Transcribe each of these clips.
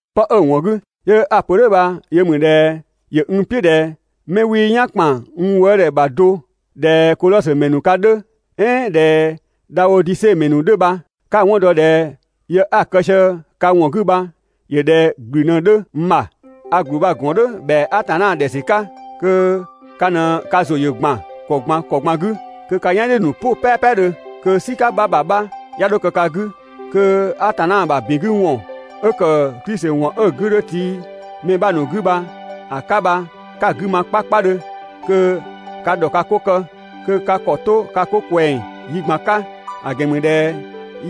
'Pë 'ö‑ ‑wɔn 'gü 'yö 'a‑ pö "dhʋ̈ bha‑ yö ‑mü ꞊dhɛ ‑yö n "piʋ̈ ꞊dhɛ 'mɛ 'wii "yan ‑kpan n wëëdhɛ ‑bha do ꞊dhɛ Kodhɔsö ‑mɛ ‑nu ka 'dhö, "ɛɛn ꞊dhɛ Dhaodise ‑mɛ ‑nu 'dhö bha, 'ka‑ 'wɔn dɔ ꞊dhɛ yë 'a‑ kë sië ka ‑wɔn 'gü bha ‑yö ꞊dhɛ ‑gblü ꞊në 'dhö n ‑bha. A ‑gblü bha‑ ‑gɔn "dhʋ̈ ‑bhɛa Atanna ‑dhɛ ‑sü 'ka kö ka ꞊në ka ‑zʋ ‑yö ‑gban ‑kɔ ꞊gban ‑kɔ ꞊gban 'gü, kö ka "yan "dhiʋ̈‑ ‑nu "pʋ "pɛpɛdhö, kö "sika 'bha ‑bha 'bha 'ya 'dho kë ka 'gü, kö Atanna ‑bha ‑bin 'gü ‑wɔn 'ö ‑kë Klisi ‑wɔn ('ö‑ 'gü 'dhö tii mɛ 'bha ‑nu 'gü) bha‑ 'ka bha 'ka‑ 'gü ma 'kpakpadhö, kö ka ‑dhɔ ka 'ko kë, kö ka ‑kɔ 'to ka 'ko ꞊kwɛng yi ꞊gban 'ka. ‑A ‑gɛn ‑mü ꞊dhɛ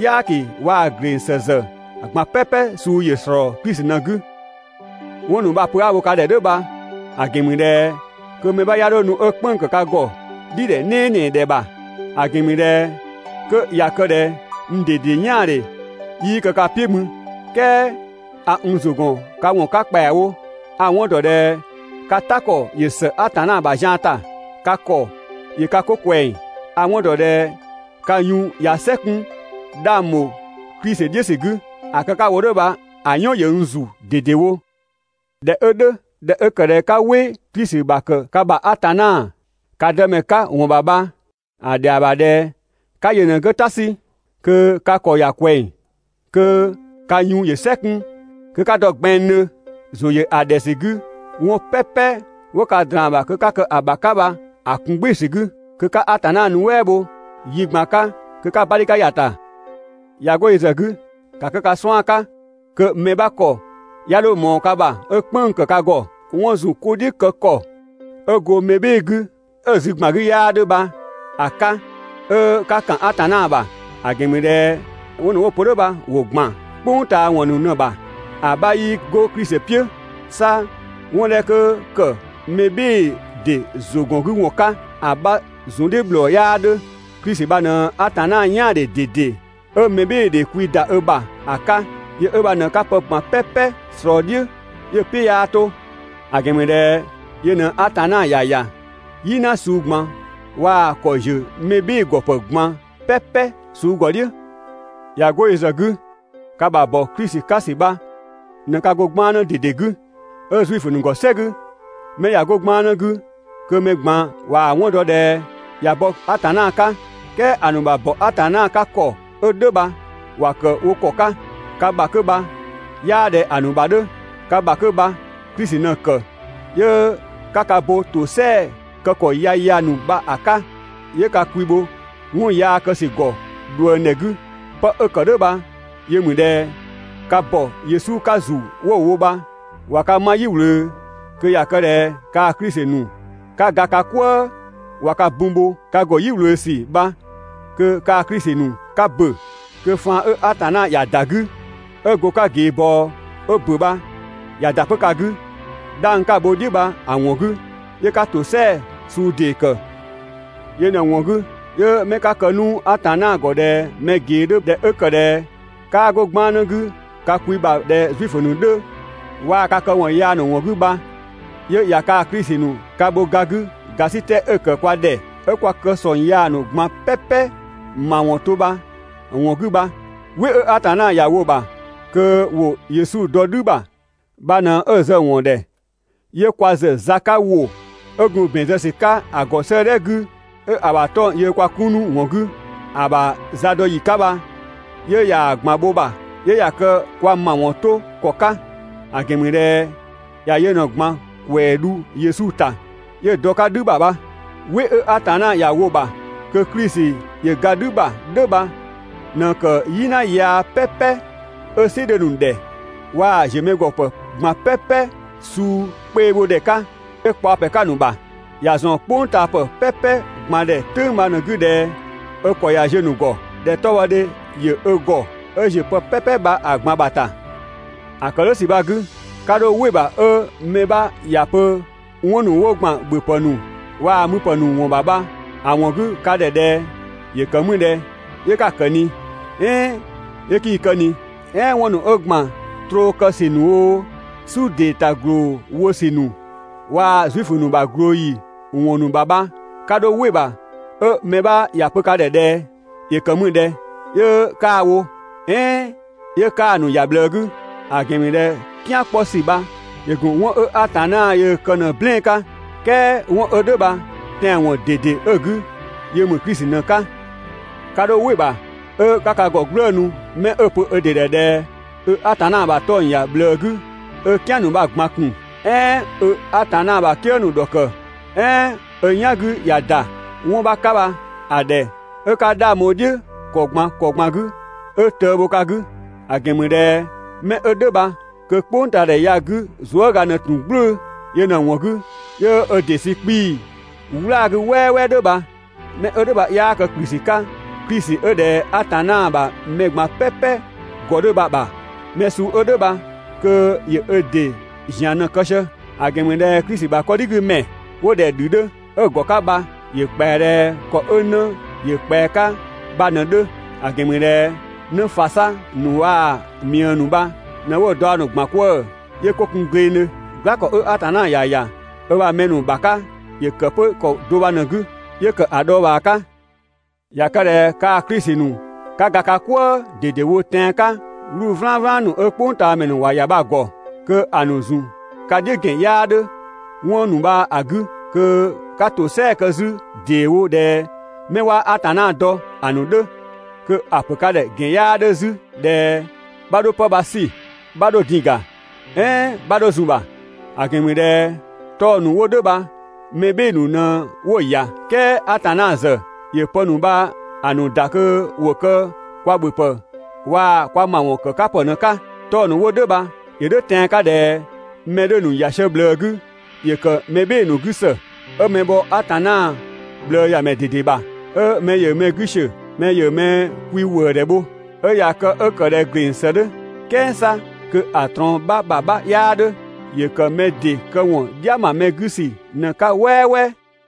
"yaaki waa‑ ‑gleng ‑së ‑zë ꞊gban "pɛpɛ suu‑ ‑slɔɔ Klisi ꞊në‑ 'gü. 'Wɔn ‑nu bha‑ pö 'a‑ wo ka ‑dhɛ "dhʋ̈ bha‑ ‑gɛn ‑mü ꞊dhɛ kö mɛ 'bha 'ya 'dho nu 'ö "kpënng‑ ‑kë ka ‑gɔ "dhidhɛ "nɛɛnɛɛdhɛ ‑bha. ‑A ‑gɛn ‑mü ꞊dhɛ 'kö ꞊ya kë ꞊dhɛ n ꞊dede "yaandhe 'yii kë ka "piʋ̈ mü "kɛɛ a n ‑zʋ ‑gɔn 'ka ‑wɔn 'ka ‑kpɛawo, a‑ 'wɔn ‑dɔ ꞊dhɛ ka "ta ‑kɔ ‑yö ‑së Atanna ‑bha zian ‑ta, ka ‑kɔ ‑yö ka 'ko ꞊kwɛng, a‑ 'wɔn ‑dɔ ꞊dhɛ ka yun ꞊ya "sɛ 'kun 'dhang ‑bho Klisi "dhiʋ̈ ‑sü 'gü. ‑A kë 'ka‑ wo "dhʋ̈ bha‑ "yɔn ‑yö n ‑zu ꞊dedewo. ꞊Dhɛ 'ö "dhʋ̈, ꞊dhɛ 'ö ‑kë ꞊dhɛ 'ka "wɩ Klisi ‑bha ‑kë ka ‑bha Atanna, ka Dëmɛ 'ka ‑wɔn ‑bha bha, ‑a ‑dhɛa ‑bha ꞊dhɛ 'ka yö ꞊në‑ 'gü ‑ta 'sü kö ka ‑kɔ ‑ya ꞊kwɛng. Kö ka yun ‑yö "sɛ 'kun, kö 'ka dɔ gbɛnngdhö ‑zʋ ‑yö ‑a ‑dhɛ ‑sü 'gü 'wɔn "pɛpɛ 'wo ka ꞊draan‑ ‑bha kö 'ka kë‑ ‑bha 'ka bha‑ ‑kun "gbɩɩ‑ ‑sü 'gü, kö 'ka Atanna nuɛ" bho yi ꞊gban 'ka kö 'ka‑ 'badhika ‑ya ‑ta. ꞊Ya 'go yö ‑zë 'gü, ‑ka kë ka 'suan‑ 'ka kö mɛ 'bha ‑kɔ 'ya 'dho ꞊mɔɔ ka ‑bha 'ö "kpënng‑ ‑kë ka ‑gɔ 'wɔn ‑zunkodhiʋ̈ kë ‑kɔ 'ö go mɛ "bhɩɩ‑ 'gü 'ö‑ zü ‑gban 'gü 'yaa 'dhö bha‑ 'ka 'ö 'ka ‑kan Atanna ‑bha. ‑A ‑gɛn ‑mü ꞊dhɛ 'wɔn ‑nu 'wo‑ pö "dhʋ̈ bha ‑wo ‑gban "kpʋng ꞊taa ‑wɔn ‑nu ꞊në‑ ‑bha, ‑a 'bha 'yii 'go Klisi "piʋ̈, 'sa 'wɔn 'dhɛ 'kö ‑kë mɛ "bhɩɩ‑ ‑dɩ ‑zʋgɔngüwɔn 'ka, ‑a 'bha ‑zundhiʋ̈ ‑bhlɔɔ 'yaa 'dhö. Klisi bha ꞊në Atanna "yaandhe ꞊dede 'ö mɛbhɩɩdhe kwi ‑da 'ö ‑bha ‑a 'ka. Yö 'ö bha ꞊në 'ka pë ꞊gban "pɛpɛ ꞊slɔɔ‑ "dhiʋ̈ 'yö‑ "piʋ̈ 'yaa 'to. ‑A ‑gɛn ‑mü ꞊dhɛ yö ꞊në Atanna ‑ya ‑ya "yina suu ꞊gban waa‑ ‑kɔ ‑ziö mɛ "bhɩɩ‑ ‑gɔ ‑pë ꞊gban "pɛpɛ suu ‑gɔ "dhiʋ̈. ꞊Ya 'go yö ‑zë 'gü, ka ‑bha ‑bɔ Klisi 'ka ‑sü bha ꞊në ka go 'gbannë ꞊dede 'gü. 'Ö Zuifö ‑nu ‑gɔ "sɛ 'gü, 'mɛ ꞊ya 'go 'gbannë 'gü kö mɛ ꞊gban ꞊waa‑ 'wɔn dɔ ꞊dhɛ ꞊ya bɔ Atanna 'ka. "Kɛɛ ‑a ‑nu ‑bha ‑bɔ Atanna 'ka ‑kɔ 'ö "dhʋ̈ bha ‑wa ‑kë wo ‑kɔ 'ka. Ka ‑bha 'kö bha 'yaa ꞊dhɛ ‑a ‑nu ‑bha 'dhö, ka ‑bha 'kö bha Klisi ꞊në‑ ‑kë 'yö 'ka ka bo ‑tosɛa kë ‑kɔ yaya ‑nu bha‑ 'ka, 'yö ka kwi bho 'wɔn yaa kë ‑sü ‑gɔ ꞊dhuëngdhɛ 'gü. 'Pë 'ö‑ ‑kë "dhʋ̈ bha yö ‑mü ꞊dhɛ: Ka ‑bɔ Yesu 'ka ‑zu 'wo‑ bho bha ꞊wa ka 'ma "yi ꞊wlöö, kö ꞊ya kë ꞊dhɛ kaa‑ Klisi ‑nu 'ka ga ka "kwëë ꞊wa ka bun bho, ka ‑go "yi ꞊wlöö ‑sü bha kö kaa‑ Klisi ‑nu 'ka ‑bö, kö faan 'ö Atanna ‑ya ‑da 'gü 'ö go‑ 'ka ꞊geebɔɔ 'ö ‑bö bha ꞊ya ‑da 'pö ka 'gü, 'dhang 'ka‑ bho‑ "dhiʋ̈ bha‑ ‑wɔn 'gü 'yö 'ka ‑tosɛa suu ‑dee ‑kë. Yö ꞊në‑ ‑wɔn 'gü 'yö 'mɛ 'ka kë 'nu Atanna ‑gɔ ꞊dhɛ mɛ ꞊gee 'dhö ꞊dhɛ 'ö ‑kë ꞊dhɛ 'kaa 'go 'gbannë 'gü ka kwi ‑bha ꞊dhɛ Zuifö ‑nu 'dhö, waa‑ ka këwɔn yaa ‑nu ‑wɔn 'gü bha, 'yö ꞊ya kaa‑ Klisi ‑nu ka bho ga 'gü ‑gasitɛ 'ö‑ ‑kë kwa ‑dhɛ 'ö kwa kë ‑sɔng yaa ‑nu ꞊gban "pɛpɛ ‑mawɔn 'to bha‑ ‑wɔn 'gü bha. "Wɩ 'ö Atanna ‑ya wo‑ ‑bha kö ‑wo Yesu dɔ "dhü ‑bha bha ꞊në 'ö zë‑ ‑wɔn ‑dhɛ 'yö kwa ‑zë za 'ka ‑wʋ 'ö gun ‑bɛn zë ‑sü 'ka ‑a ‑gɔ 'sëëdhɛ 'gü 'ö‑ ‑bha 'tɔng‑ yöö kwa 'kun 'nu‑ ‑wɔn 'gü, ‑a ‑bha zadɔyi 'ka bha 'yö ꞊yaa‑ ꞊gban bho‑ ‑bha, 'yö ꞊ya kë kwa ‑mawɔn 'to ‑kɔ 'ka, ‑a ‑gɛn ‑mü ꞊dhɛ ‑ya yö ꞊në‑ ꞊gban ‑kwɛɛ dhu Yesu ‑ta 'yö dɔ‑ 'ka "dhü ‑bha bha. "Wɩ 'ö Atanna ‑ya wo‑ ‑bha kö Klisi ‑yö ga "dhü ‑bha "dhʋ̈ bha ꞊në ‑kë "yina yaa "pɛpɛ 'ö "sɩ 'dhö‑ ‑nu ‑dhɛ waa‑ ‑ziö mɛ ‑gɔ ‑pë ꞊gban "pɛpɛ suu 'kpeebhodhɛ 'ka 'yö kpaɔ ‑pɛ 'ka‑ ‑nu ‑bha. ‑Ya ‑zɔn ("kpʋngtaapë "pɛpɛ ꞊gban ‑dhɛ) "tʋ̈ng bha‑ ꞊në‑ 'gü ꞊dhɛ ö ‑kɔ ꞊ya ziö‑ ‑nu ‑gɔ, ꞊dhɛ 'tɔbhɔdhe ‑yö ö ‑gɔ 'ö ‑ziö pë "pɛpɛ bha‑ ꞊gban ‑bha ‑ta. ‑A ‑kë "dhʋ̈ ‑sü bha‑ 'gü, 'ka 'dho "wɩ‑ ‑bha 'ö mɛ 'bha ‑ya pö 'wɔn ‑nu 'ö ‑gban ‑bhöpë ‑nu waa‑ müpë ‑nu ‑wɔn ‑bha bha‑ ‑wɔn 'gü ka ‑bha ꞊dhɛ: «‑Yö ‑kë mü ꞊dhɛ 'yö 'ka‑ ‑kë ꞊ni?» "ɛɛn: «'Yö 'kii‑ kë ꞊ni?» "ɛɛn 'wɔn ‑nu 'ö ‑gban troo kë ‑sü ‑nu oo, "su ‑dee ‑ta ‑gloo wo ‑sü ‑nu waa‑ Zuifö ‑nu ‑bha ꞊glooyi ‑wɔn ‑nu ‑bha bha 'ka 'dho "wɩ‑ ‑bha 'ö mɛ 'bha ‑ya pö ka ‑dhɛ ꞊dhɛ: «‑Yö ‑kë mü ꞊dhɛ 'yö 'kaa‑ wo?» "ɛɛn: «'Yö 'kaa‑ ‑nu ‑ya ꞊bhlëë 'gü?» ‑A ‑gɛn ‑mü ꞊dhɛ "kian 'kpɔ ‑sü bha ‑yö ‑gun 'wɔn 'ö Atanna yöö‑ kë ꞊në‑ "blɛɛn‑ 'ka, "kɛɛ 'wɔn 'ö "dhʋ̈ bha‑ tɛanwɔn ꞊dede 'ö‑ 'gü yö ‑mü Klisi ꞊në‑ 'ka. 'Ka 'dho "wɩ‑ ‑bha 'ö 'ka ka ‑gɔ "gblëënu 'mɛ 'ö‑ pö ö ‑dɩ ‑dhɛ ꞊dhɛ ö Atanna ‑bha 'tɔng‑ ‑ya ꞊bhlëë 'gü, ö "kian ‑nu bha‑ ꞊gban ‑kun "ɛɛn 'ö Atanna ‑bha "kië ‑nu ‑dhɔkë, "ɛɛn ö "yan 'gü ꞊ya ‑da 'wɔn 'bha 'ka bha‑ ‑dhɛ 'ö 'ka 'dhang bho‑ "dhiʋ̈ ‑kɔ ꞊gban ‑kɔ ꞊gban 'gü 'ö tëë bho ka 'gü. ‑A ‑gɛn ‑mü ꞊dhɛ 'mɛ 'ö "dhʋ̈ bha kö "kpʋngtaadhɛ ya‑ 'gü zuëga ꞊në ‑tun "gblʋ̈ʋ̈‑, yö ꞊në‑ ‑wɔn 'gü 'yö ö ‑dɩ sü 'kpii‑ "wlaa‑ 'gü "wɛɛwɛɛ "dhʋ̈ bha. 'Mɛ 'ö "dhʋ̈ bha 'yaa kë ‑kplü ‑sü 'ka Klisi 'ö ꞊dhɛ Atanna ‑bha mɛ ꞊gban "pɛpɛ ‑gɔ 'dhö bha‑ ‑bha. Mɛ suu 'ö "dhʋ̈ bha kö ‑yö ö ‑dɩ ‑zian ꞊në‑ kë sië. ‑A ‑gɛn ‑mü ꞊dhɛ Klisi ‑bha 'kɔdhigümɛ 'wo ꞊dhɛ‑ ‑dhü 'dhö, 'ö‑ ‑gɔ 'ka bha ‑yö ‑kpɛa ꞊dhɛ ‑kɔ 'ö 'në ‑yö ꞊kpɛa‑ 'ka bha ꞊në‑ 'dhö, ‑a ‑gɛn ‑mü ꞊dhɛ 'në ‑fasa ‑nu waa‑ ꞊miëë ‑nu bha ꞊në 'wo‑ daɔ ‑nu ‑gban 'kwëë‑ 'yö 'ko kun glengdhö. "Gla ‑kɔ 'ö Atanna ‑ya ‑ya ö ‑bha mɛ ‑nu ‑bha 'ka ‑yö ‑kë 'pö ‑kɔ do bha‑ ꞊në‑ 'gü 'yö ‑kë ‑a dhɔɔbhaa 'ka. ꞊Ya kë ꞊dhɛ kaa‑ Klisi ‑nu 'ka ga ka "kwëë ꞊dedewo tɛan‑ 'ka 'wluu‑ "vlanvlan ‑nu 'ö "kpʋngtaamɛ ‑nu ‑wa ‑ya bha‑ ‑gɔ, kö‑ ‑nu ‑zun ka "dhiʋ̈ ‑gɛn 'yaa 'dhö 'wɔn ‑nu bha‑ 'gü kö 'ka ‑tosɛa kë 'zü ‑deewo ꞊dhɛ 'mɛ 'waa Atanna dɔ ‑a ‑nu 'dhö. Kö ‑a ‑pö ka ‑dhɛ ‑gɛn 'yaa 'dhö 'zü ꞊dhɛ 'bha 'dho 'pë bha‑ 'sü, 'bha 'dho‑ din ga, "ɛɛn 'bha 'dho zun‑ ‑bha! ‑A ‑gɛn ‑mü ꞊dhɛ 'tɔng‑ ‑nu 'wo "dhʋ̈ bha mɛ "bhɩɩ‑ ‑nu ꞊në 'wo‑ ‑ya "kɛɛ Atanna ‑zë ‑yö pë ‑nu bha‑ ‑nu ‑da kö ‑wo kë kwa ‑bhöpë waa‑ kwa ‑mawɔn ‑kë 'ka ‑pë ꞊në‑ 'ka. 'Tɔng‑ ‑nu 'wo "dhʋ̈ bha ‑yö "dhʋ̈ tɛan‑ 'ka ꞊dhɛ mɛ 'dhö‑ ‑nu ‑ya sië ꞊bhlëë 'gü ‑yö ‑kë mɛ "bhɩɩ‑ ‑nu 'gü ‑së, 'ö mɛ bhɔ Atanna ꞊bhlëëyamɛ ꞊dede ‑bha, 'ö mɛ ‑yö mɛ 'gü ‑siö mɛ ‑yö mɛ kwi ‑wëëdhɛ bho, 'ö ꞊ya kë 'ö ‑kë ꞊dhɛ ‑gleng ‑së 'dhö, "kɛɛ 'sa kö‑ ꞊trɔɔn 'bha ‑bha 'bha 'yaa 'dhö. ‑Yö ‑kë mɛ ‑dɩ këwɔn "dhia ‑ma mɛ 'gü ‑sü ꞊në‑ 'ka "wɛɛwɛɛ.